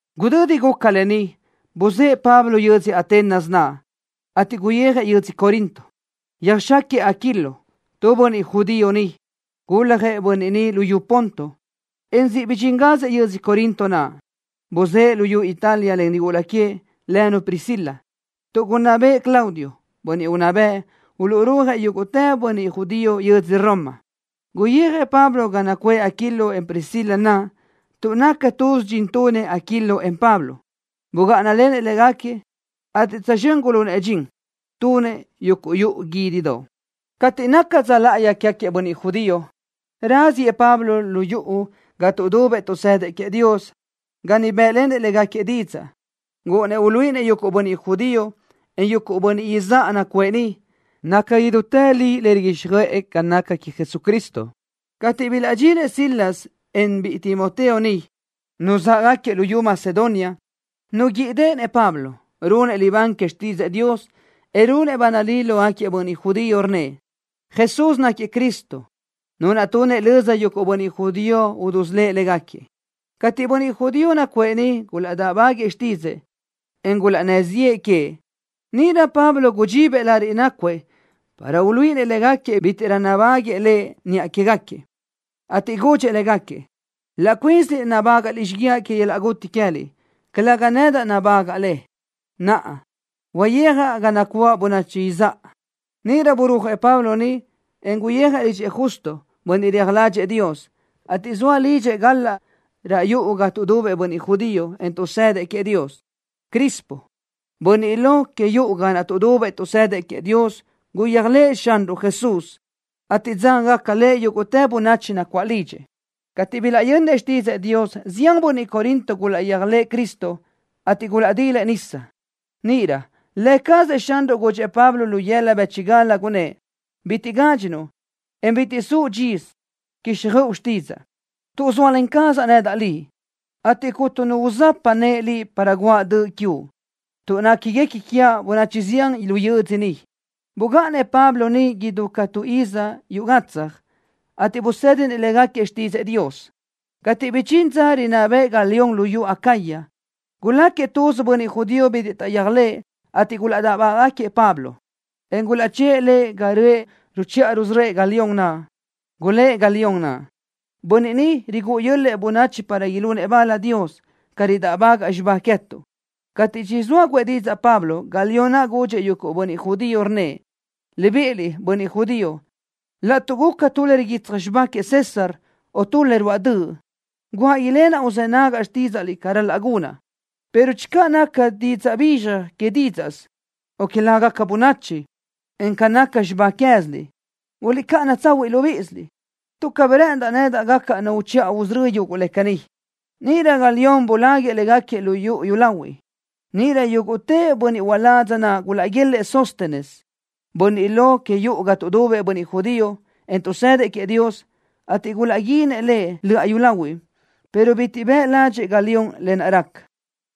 Gudödi guca lë ni, buzë́ʼë Pablo yödzö Atenas naʼ, ateʼ guyijëʼ yödzö Corinto. Yöjxáquiëʼ Aquilo, tu bönniʼ judío niʼ. Guljëʼ bönniʼ ni luyú Ponto, en siʼ bidxíngazëʼ yödzö Corinto naʼ. Buzë́ʼë luyú Italia len nigula queëʼ, lënu Priscila, tuʼ gunná bëʼë Claudio, bönniʼ unná bëʼ, uluʼrúajëʼ yúguʼtë bönniʼ judío yödzö Roma. Guyijëʼ Pablo ga nacuʼë Aquilo, en Priscila naʼ tuʼ naca tuz dxin tunëʼ Aquilo, en Pablo. Bugáʼanalenëʼ légaquiëʼ, ateʼ tsözxö́n gulunëʼ dxin, tunëʼ yuguʼ yuʼu guídidoʼ. Cateʼ nácagaca dza láʼayi quégaquiëʼ bönniʼ judío, raziëʼ Pablo lu yuʼu ga tuʼdubëʼ tuʼsëdëʼ queëʼ Dios, ga niʼ bë́ʼlenëʼ légaquiëʼ didzaʼ. Gúʼunnëʼ uluíʼinëʼ yuguʼ bönniʼ judío, en yuguʼ bönniʼ izáʼa nacuʼë niʼ, naca idútë li le riguíxjöʼë ca naca queëʼ Jesucristo. Cateʼ bilaʼdxinëʼ Silas, en biʼi Timoteo niʼ, nuzáʼagaquiëʼ luyú Macedonia, nuguíʼideʼenëʼ Pablo, runëʼ libán que xtídzëʼë Dios, en runëʼ ba nalí lógaquiëʼ bönniʼ judío, rnnëʼ: —Jesús náquiëʼ Cristo, Nu naʼ tunëʼ löza yuguʼ bönniʼ judío udusölë́ʼ légaquiëʼ. Cateʼ bönniʼ judío nacuʼë niʼ gulaʼdáʼbáguëʼë xtídzëʼë, en gulaʼnnë́ ziʼë que, níʼirö Pablo gudxibëʼ lariʼ nácuëʼ para uluíʼinëʼ légaquiëʼ bítiʼrö nabáguëʼë lëʼ niʼa quégaquiëʼ, ateʼ gudxëʼ légaquiëʼ: —Laʼ cuínsiliʼ nabágaʼliʼ xíguiaʼ que yöl-laʼ guti queë́liʼ, calëga nedaʼ nabágaʼa le. Naʼa, uyijaʼ ga nacuáʼ bönachi izáʼa. Níʼirö burúajëʼ Pablo niʼ, en guyijëʼ lidxëʼ Justo, bönniʼ reaj ládxëʼë Dios, ateʼ zoa lidxëʼ gal-laʼ raʼ yuʼu ga tuʼdubëʼ bönniʼ judío, en tuʼsëdëʼ queëʼ Dios. Crispo, bönniʼ lo que yuʼu ga naʼ tuʼdubëʼ tuʼsëdëʼ queëʼ Dios guyéajlëʼë Xanruʼ Jesús, ateʼ dzágagaca lëʼ yúguʼtë bönachi nacuáʼ lidxëʼ. Cateʼ bilaʼyönnëʼ xtídzëʼë Dios, zián bönniʼ Corinto gulaʼyéajlëʼë Cristo, ateʼ gulaʼdilëʼ nisa. Níʼirö Lë cazëʼ Xanruʼ gudxëʼ Pablo lu yëla bë́chigal, gunnë́ʼ: —Bitiʼ gádxinuʼ, en bitiʼ suʼ dxisö, quíxjöʼu xtídzaʼa, tuʼ zóalen cazaʼ nedaʼ liʼ, ateʼ cuntu nu uzapaʼ nëʼe liʼ para guáʼ döʼ quiuʼ, tuʼ néquiguequi quiaʼ bönachi zián lu yödzö ni. Bugáʼanëʼ Pablo niʼ idú ca tu iz yuʼ gatsaj, ateʼ busédinëʼ légaquiëʼ xtídzëʼë Dios. Cateʼ bidxín dza rinná bëʼë Galión luyú Acaya, guláquiëʼ tuz bönniʼ judío bitiʼ taʼyéajlëʼ, ateʼ gulaʼdáʼbáguëʼë Pablo, en gulaʼchë́ʼë lëʼ ga röʼë ruchiʼa rusörö́ëʼ Galión naʼ. Gulë́ʼ Galión naʼ: —Bönniʼ ni rigúʼu yö́l-lëʼë bönachi para ilunëʼ bal Dios, ca ridáʼbagaʼ xibá queë́tuʼ. Cateʼ chizóa guʼë didzaʼ Pablo, Galión naʼ gudxëʼ yuguʼ bönniʼ judío, rnnëʼ: —Libíʼiliʼ, bönniʼ judío, laʼtuʼ guca tu le riguitsaj xibá queëʼ César, o tu le ruáʼ döʼ, guáʼ ilenaʼ uzë́ nagaʼ xtídzaʼliʼ ca ral-laʼ gunaʼ, pero channö naca didzaʼ bizxaj que dídzaʼsö, o que lágaca bönachi, en ca naca xibá queë́ziliʼ, guliʼcáʼana tsahuiʼ libíʼisiliʼ, tuʼ cabí rë́ʼëndaʼ nedaʼ gacaʼ nu uchiʼa usörö́ yuguʼ le caní. Níʼirö Galión buláguiʼë légaquiëʼ lu yuʼu yúlahuiʼ. Níʼirö yúguʼtë bönniʼ uládz naʼ gulaʼguélëʼë Sóstenes, bönniʼ lo que yuʼu ga tuʼdubëʼ bönniʼ judío, en tuʼsëdëʼ queëʼ Dios, ateʼ gulaʼguínëʼ lëʼ löʼa yúlahuiʼ, pero bitiʼ bëʼ ládxëʼë Galión lë naʼ raca.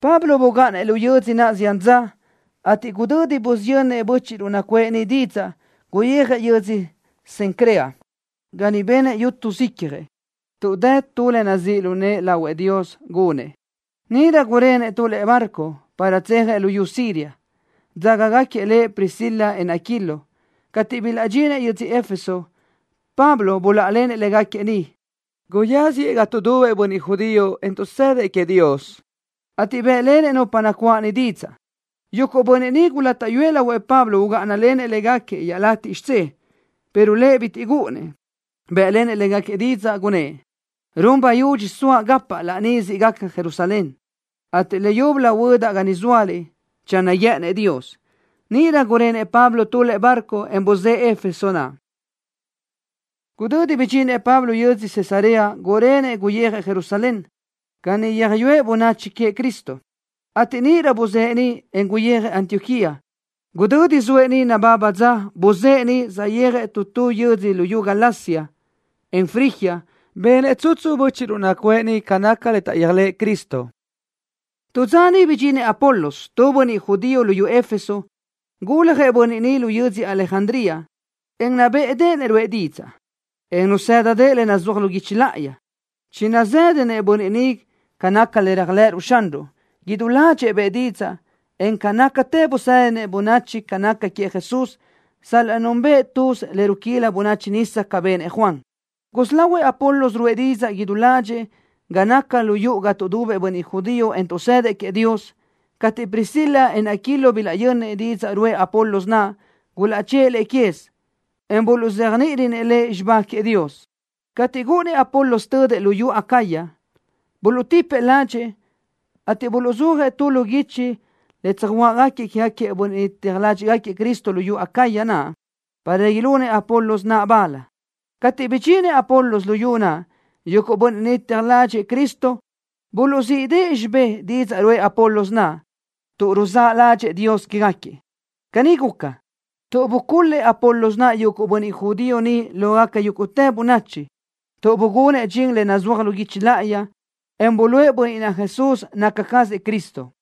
Pablo bugáʼanëʼ lu yödzö naʼ zián dza, ateʼ gudödi busiyönnëʼ bö́chiʼruʼ nacuʼë niʼ didzaʼ, guyijëʼ yödzö Cencrea, ga niʼ benëʼ yútusö icjëʼ, tuʼ dë tu le nazíʼ lu nëʼë lahuëʼ Dios gunëʼ. Níʼirö gurenëʼ tu lëʼe barco, para tsejëʼ luyú Siria, dzágagaquiëʼ lëʼ Priscila, en Aquilo. Cateʼ bilaʼdxinëʼ yödzö Éfeso, Pablo buláʼalenëʼ légaquiëʼ niʼ. Guyáziëʼ lu yuʼu ga tuʼdubëʼ bönniʼ judío, en tuʼsëdëʼ queëʼ Dios, ateʼ bë́ʼlenëʼ nupa nacuáʼ niʼ didzaʼ. Yuguʼ bönniʼ niʼ gulátaʼyuëʼ lahuëʼ Pablo ugáʼanalenëʼ légaquiëʼ iaʼlatiʼ xidzé, pero lëʼ bitiʼ gúʼunnëʼ. Bë́ʼlenëʼ légaquiëʼ didzaʼ, gunnë́ʼ: —Run bayudxi soaʼ gapaʼ laní siʼ gaca Jerusalén, ateʼ leyúbölö huödaʼ ga ni zóaliʼ, channö guë́ʼënnëʼ Dios. Níʼirö gurenëʼ Pablo tu lëʼe barco, en buzë́ʼë Éfeso naʼ. Gudödi bidxinëʼ Pablo yödzö Cesarea, gurenëʼ guyijëʼ Jerusalén, ga niʼ yöjyúëʼ bönachi queëʼ Cristo, ateʼ níʼirö buzë́ʼë niʼ, en guyijëʼ Antioquía. Gudödi zoëʼ niʼ nababa dza, buzë́ʼë niʼ, saʼyéajëʼ tu tu yödzö luyú Galacia, en Frigia. Benëʼ tsutsu bö́chiʼruʼ nacuʼë niʼ ca naca le taʼyéajlëʼë Cristo. Tu dza niʼ bidxinëʼ Apolos, tu bönniʼ judío lu yödzö Éfeso. Guljëʼ bönniʼ ni lu yödzö Alejandría, en nabéʼedeʼenëʼ ruʼë didzaʼ, en nazë́dadëʼë le nazúaj lu guichi láʼayi. Chinazëdëʼ bönniʼ ni ca naca le réajlëʼëruʼ Xanruʼ. Idú ládxëʼë bëʼë didzaʼ, en ca nácatë busédinëʼ bönachi ca naca queëʼ Jesús, sal-laʼ núnbëʼë tuz le ruquíla bönachi nisa ca benëʼ Juan. Gusí lahuëʼ Apolos ruʼë didzaʼ idú ládxëʼë ga naca lu yuʼu ga tuʼdubëʼ bönniʼ judío, en tuʼsëdëʼ queëʼ Dios. Cateʼ Priscila, en Aquilo bilaʼyönnëʼ didzaʼ ruʼë Apolos naʼ, gulaʼchë́ʼë lëʼ quez, en buluʼzéajniʼirönëʼ lëʼ xibá queëʼ Dios. Cateʼ gúʼunnëʼ Apolos tödëʼ luyú Acaya, buluʼtipëʼ ládxëʼë, ateʼ buluʼzúajëʼ tu lu guichi le tsöjuáʼgaquiëʼ quégaquiëʼ bönniʼ teaj ládxëʼë Cristo luyú Acaya naʼ, para ilunëʼ Apolos naʼ bal. Cateʼ bidxinëʼ Apolos luyú naʼ, yuguʼ bönniʼ niʼ teaj ládxëʼë Cristo buluʼzíʼdëʼë xibé didzaʼ ruʼë Apolos naʼ, tuʼ ruzáʼ ládxëʼë Dios quégaquiëʼ. Caní guca, tuʼ bucul-lëʼ Apolos naʼ yuguʼ bönniʼ judío niʼ lógaca yúguʼtë bönachi, tuʼ bugunëʼ dxin le nazúaj lu guichi láʼayi, en buluʼe bönniʼ naʼ Jesús naca cazëʼ Cristo.